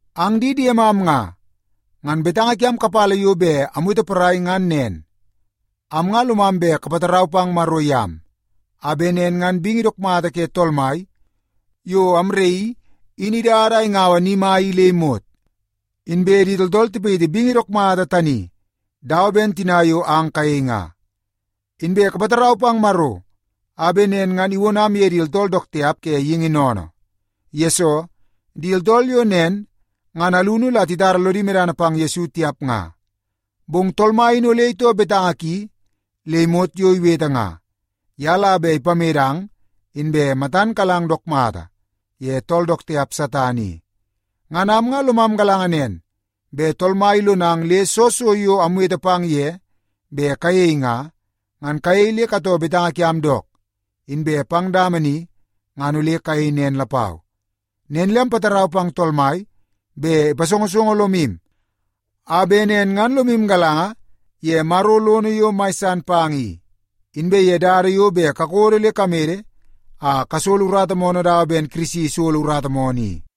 Ang di diemam nga, ngan betanga kiam kapala yo bet amwete porai ngan nen. Am nga lomam bet kapatarau pang Maro yam a bet nen ngan bingi dook mata ke Tool Mai yo amraii in idada a ingaua ni mai i le imot, inbe di tooltool tipayiti bingi dook mata tani dawa ben tina yo ang kayei nga. Inbe kapatarau pang Maro a bet nen ngan iwonam ye di tooltool dook tiap ke geingi sennene. Yesoo, di tooltool yo nen ngan alunu la titara lodi medana pang Yesu tiap nga. Bong Tool Mai in ole itoo betanga ki le imot yo iwete nga. Ye la bet ipamedang inbe matan kalang dook mata ye tool dook tiap Satan i. Ngan am nga lomam galanga nen bet Tool Mai ilonang le soo so yo amwete pang ye bet kayei nga, ngan kayei le katoo betanga kiam dook, inbe pang dama ni ngan ole kayei nen lapau. Nen le ampatarau pang Tool Mai bet ipasongosongo lomu a bet nen ngan lomu galanga ye Maro lono yo mai san pang i, inbe ye dada yo bet kakodo le kamede a kasolo urata moonoo dawa ben Kirisi isolo urata moonoo i.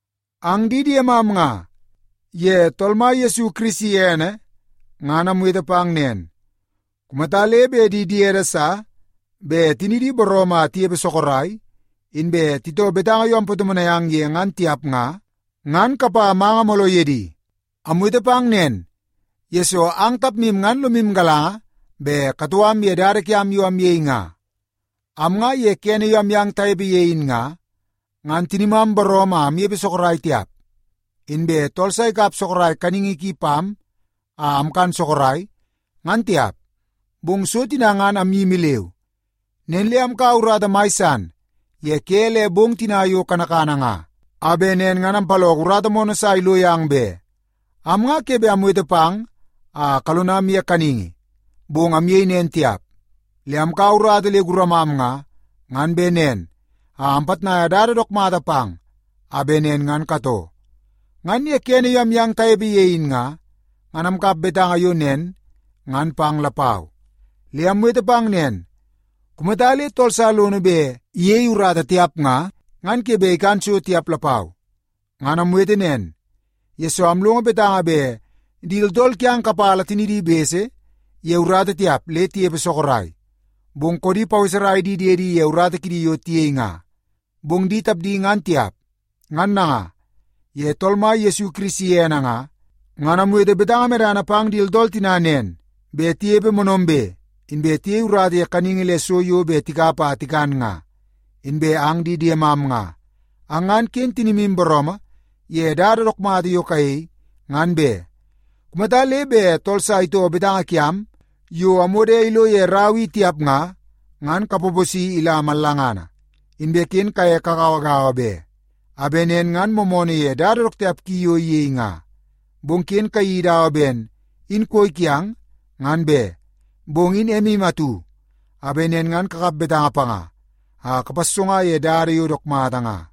Ang di diemam nga, ye Tool Mai Yesu Kirisi ene ngan amwete pang nen. Kumata le bet di diede sa bet tinidi booroomoo a tinepe sorok, inbe titoo betanga yo ampatomonai ang ye ngan tiap nga, ngan kapa manga mooloo ye di. Amwete pang nen, yesoo ang tapmu ngan lomu galanga bet katoo am ye dada kiam yo amyei nga. Am nga ye kene yo amyang tanepe ye in nga, ngan tinimam booroomoo a amnepe sorok tiap, inbe tool sa ikap sorok kaningi ki pam a amkan sorok, ngan tiap. Bong so tina ngan amyimi leu. Nen le amkaua urata mai san ye ke le bong tina yo kanakana nga a bet nen ngan ampaloko urata moonoo sa ilo yang be. Am nga ke bet amwete pang a kalonam ye kaningi, bong amyei nen tiap. Le amkaua urata le guramam nga, ngan bet nen a ampitnai dada dook mata pang a bet nen ngan katoo. Ngan ye kene yo amyang tanepe ye in nga, ngan amkap betanga yo nen ngan pang lapau. Le amwete pang nen, “Kumata le tool sa lono bet iyei urata tiap nga, ngan ke bet ikan so tiap lapau.” Ngan amwete nen, yesoo amlongo betanga bet di tooltool kiang kapala tinidi bese ye urata tiap le tinepe sorok, bong koodi paweserai di diedi ye urata kidi yo tiyei nga. Bong di tapdi ngan tiap. Ngan nanga, ye Tool Mai Yesu Kirisi ene nga, ngan amwete betanga medana pang di tooltool tina nen bet tinepe moonoombe, inbe tiyei urata ye kaningi le so yo bet tikap a tikan nga. Inbe ang di diemam nga, ang ngan ken tinimu booroomoo ye dada dook mata yo kayei, ngan be. Kumata le bet tool sa itoo betanga kiam yo amwodo ilo ye rau i tiap nga, ngan kapaposi ila mallangana. Inbe ken kaye kagauagaua be, a bet nen ngan moomoonoo ye dada dook tiap ki yo iyei nga. Bong ken kayeii dawa ben in koi kiang ngan be. Bong in emu atu a bet nen ngan kakap betanga panga a kapassonga ye dada yo dook mata nga.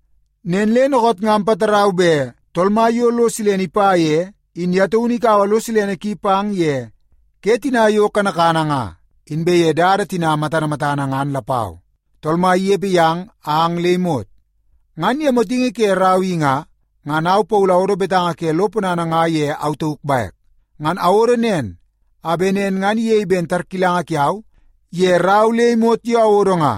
Nen le dookoot nga ampatarau bet Tool Mai yo lo silene ipa ye, in ye taunu ikaua lo silene ki pang ye ke tina yo kanakana nga, inbe ye dada tina matana matana ngan lapau. Tool Mai inepe yang ang le imot. Ngan ye motingi ke rau i nga, ngan au Paulu awodo betanga ke lo ponana nga ye au tauk bek. Ngan awodo nen a bet nen ngan iyei ben tarkilanga kiau ye rau le imot yo awodo nga.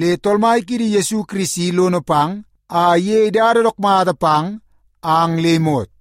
Le Tool Mai kiidi Yesu Kirisi lono pang a iyei dada dook mata pang ang le imot.